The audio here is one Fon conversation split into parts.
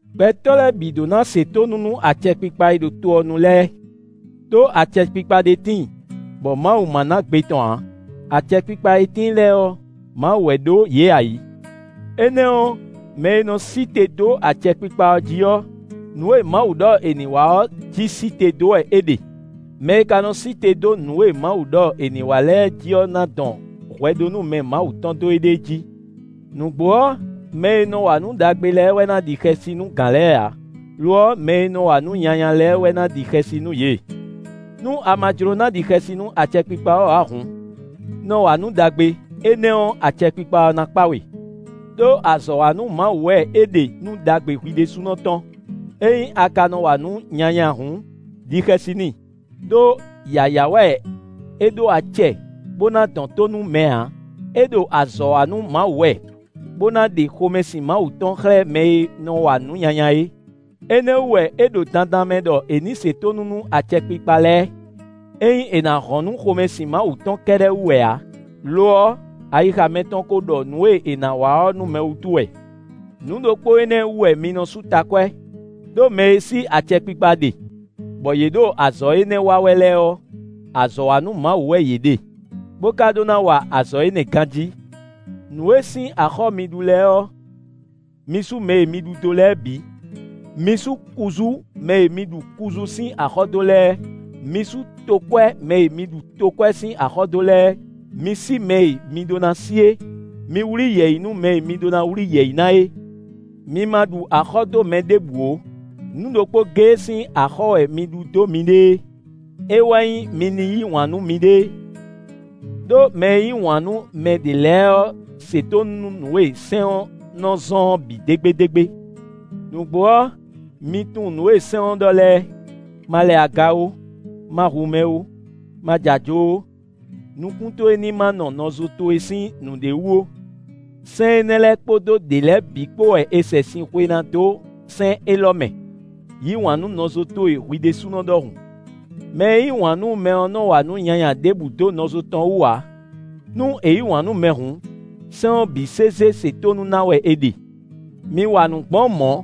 Gbɛtɔ́ lɛ́ɛ bǐ ɖó ná se tónú nú acɛkpikpa e ɖo to ɔ́ nu lɛ́ɛ, ɖó acɛkpikpa ɖé tíin, bɔ Mawu ma ná gbe tɔn ǎ; acɛkpikpa e tíin lɛ́ɛ ɔ́, Mawu wɛ ɖó yě ayǐ. Énɛ́ ɔ́, mɛ e nɔ sí te dó acɛkpikpa ɔ́ jí ɔ́, nǔ e Mawu ɖɔ è nǐ wa ɔ́ jí sí te dó wɛ é ɖe. Mɛ e ka nɔ sí te dó nǔ e Mawu ɖɔ è nǐ wa lɛ́ɛ jí ɔ́ ná dɔn hwɛɖónúmɛ Mawu tɔn dó éɖée jí. Nǔgbó ɔ́, mɛ e nɔ wa nǔ ɖagbe lɛ́ɛ wɛ ná ɖi xɛsi nú gǎn lɛ́ɛ ǎ; lo ɔ́, mɛ e nɔ wa nǔ nyanya lɛ́ɛ wɛ na ɖi xɛsi nú yě. Nú a ma jló ná ɖi xɛsi nú acɛkpikpa ɔ́ ǎ hǔn, nɔ wa nǔ ɖagbe; énɛ́ ɔ́, acɛkpikpa ɔ́ ná kpá we; ɖó azɔ̌ wa nú Mawu wɛ é ɖe nú ɖagbe hwi ɖésúnɔ tɔn. Ényí a ka nɔ wa nǔ nyanya hǔn, ɖi xɛsi n'i; ɖó yǎyá wɛ é ɖó acɛ bó ná dɔn tó nú mɛ ǎ: É ɖo azɔ̌ wa nú Mawu wɛ, bó ná ɖe xomɛsin Mawu tɔn xlɛ́ mɛ e nɔ wa nǔ nyanya é. Énɛ́ wú wɛ é ɖo dandan mɛ ɖɔ è nǐ se tónú nú acɛkpikpa lɛ́ɛ; ényí è nǎ hɔn nú xomɛsin Mawu tɔn kɛ́ɖɛ́ wú wɛ ǎ; lo ɔ́, ayixa mɛtɔn ko ɖɔ nǔ e è nǎ wa ɔ́ nú mɛ wútu wɛ. Nǔ ɖokpó énɛ́ wú wɛ mi nɔ sú takwɛ́; ɖó mɛ e sí acɛkpikpa ɖe, bɔ yě ɖo azɔ̌ énɛ́ wa wɛ lɛ́ɛ ɔ́, azɔ̌ wa nú Mawu wɛ yě ɖe, bó ka ɖó ná wa azɔ̌ énɛ́ ganjí. Nǔ e sín axɔ́ mi ɖu lɛ́ɛ ɔ́, mi sú mɛ e mi ɖu dó lɛ́ɛ bǐ. Mi sú kuzú mɛ e mi ɖu kuzú sín axɔ́ dó lɛ́ɛ; mi sú tokwɛ́ mɛ e mi ɖu tokwɛ́ sín axɔ́ dó lɛ́ɛ. Mi sí mɛ e mi ɖó ná sí é; mi wlí yɛ̌yi nú mɛ mi ɖó ná wlí yɛ̌yi ná é. Mi ma ɖu axɔ́ dó mɛ ɖěbǔ ó; nǔ ɖokpó géé sín axɔ́ wɛ mi ɖu dó miɖée; é wɛ nyí mi ní yí wǎn nú miɖée; ɖó mɛ e yí wǎn nú mɛ ɖě lɛ́ɛ ɔ́ se tónú nú nǔ e sɛ́n ɔ́ nɔ zɔ́n ɔ́ bǐ dégbédégbé. Nǔgbó ɔ́, mi tunwun nǔ e sɛ́n ɔ́ ɖɔ lɛ́ɛ: “Ma lɛ aga ó, ma hu mɛ ó, ma jɛ ajo ó, nukún towe ní má nɔ nɔzo towe sín nǔɖé wú ó”; sɛ́n énɛ́ lɛ́ɛ kpódó ɖě lɛ́ɛ bǐ kpó wɛ è sɛ sin xwe ná dó sɛ́n élɔ́ mɛ: “Yǐ wǎn nú nɔzo towe hwi ɖésúnɔ ɖɔhun.” Mɛ e yí wǎn nú mɛ ɔ́ nɔ wa nǔ nyanya ɖěbǔ dó nɔzo tɔn wú ǎ. Nú è yí wǎn nú mɛ hǔn, sɛ́n ɔ́ bǐ sésé se tónú ná wɛ è ɖe. Mi wa nǔ gbɔn mɔ̌,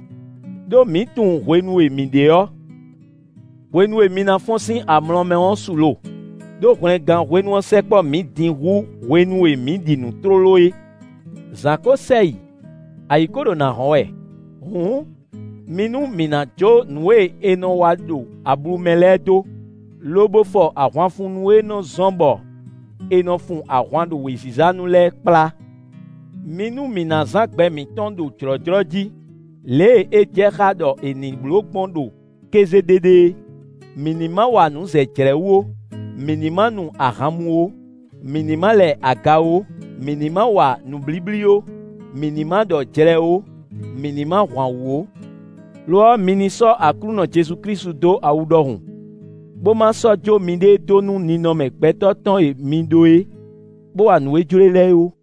ɖó mǐ tunwun hwenu e mǐ ɖe ɔ́. Hwenu e mi ná fɔ́n sín amlɔ mɛ ɔ́ su lo; ɖó hwlɛngán hwenu ɔ́ sɛkpɔ́ mǐ din hú hwenu e mǐ ɖi nǔ tlóló é. Zǎn kó sɛ yi; ayǐ kó ɖo nǎ hɔ́n wɛ. Hǔn, mi nú mǐ ná jó nǔ e è nɔ wa ɖo ablu mɛ lɛ́ɛ dó, lobo fɔ ahwanfunnú e nɔ́ zɔ́n bɔ è nɔ fun ahwan ɖo wěziza nu lɛ́ɛ kplá. Mi nú mǐ ná zán gbɛ mǐtɔn ɖo jlɔ̌jlɔ́ jí, lě e é jɛ xá ɖɔ è nǐ bló gbɔn ɖo kéze ɖéɖé é. Mǐ ní ma wa nǔ zɛ jlɛ̌ wú ó; mǐ ní ma nu ahan mú ó; mǐ ní ma lɛ aga ó; mǐ ní ma wa nǔblíblí ó; mǐ ní ma ɖɔ jlɛ ó; mǐ ní ma hwan wǔ ó. Lo ɔ́, mi ní sɔ́ Aklúnɔ Jezu Klísu dó awu ɖɔhun, bó ma sɔ́ jó miɖée dó nú ninɔmɛ gbɛtɔ́ tɔn e mi ɖó é, bó wa nǔ e jló e lɛ́ɛ ó.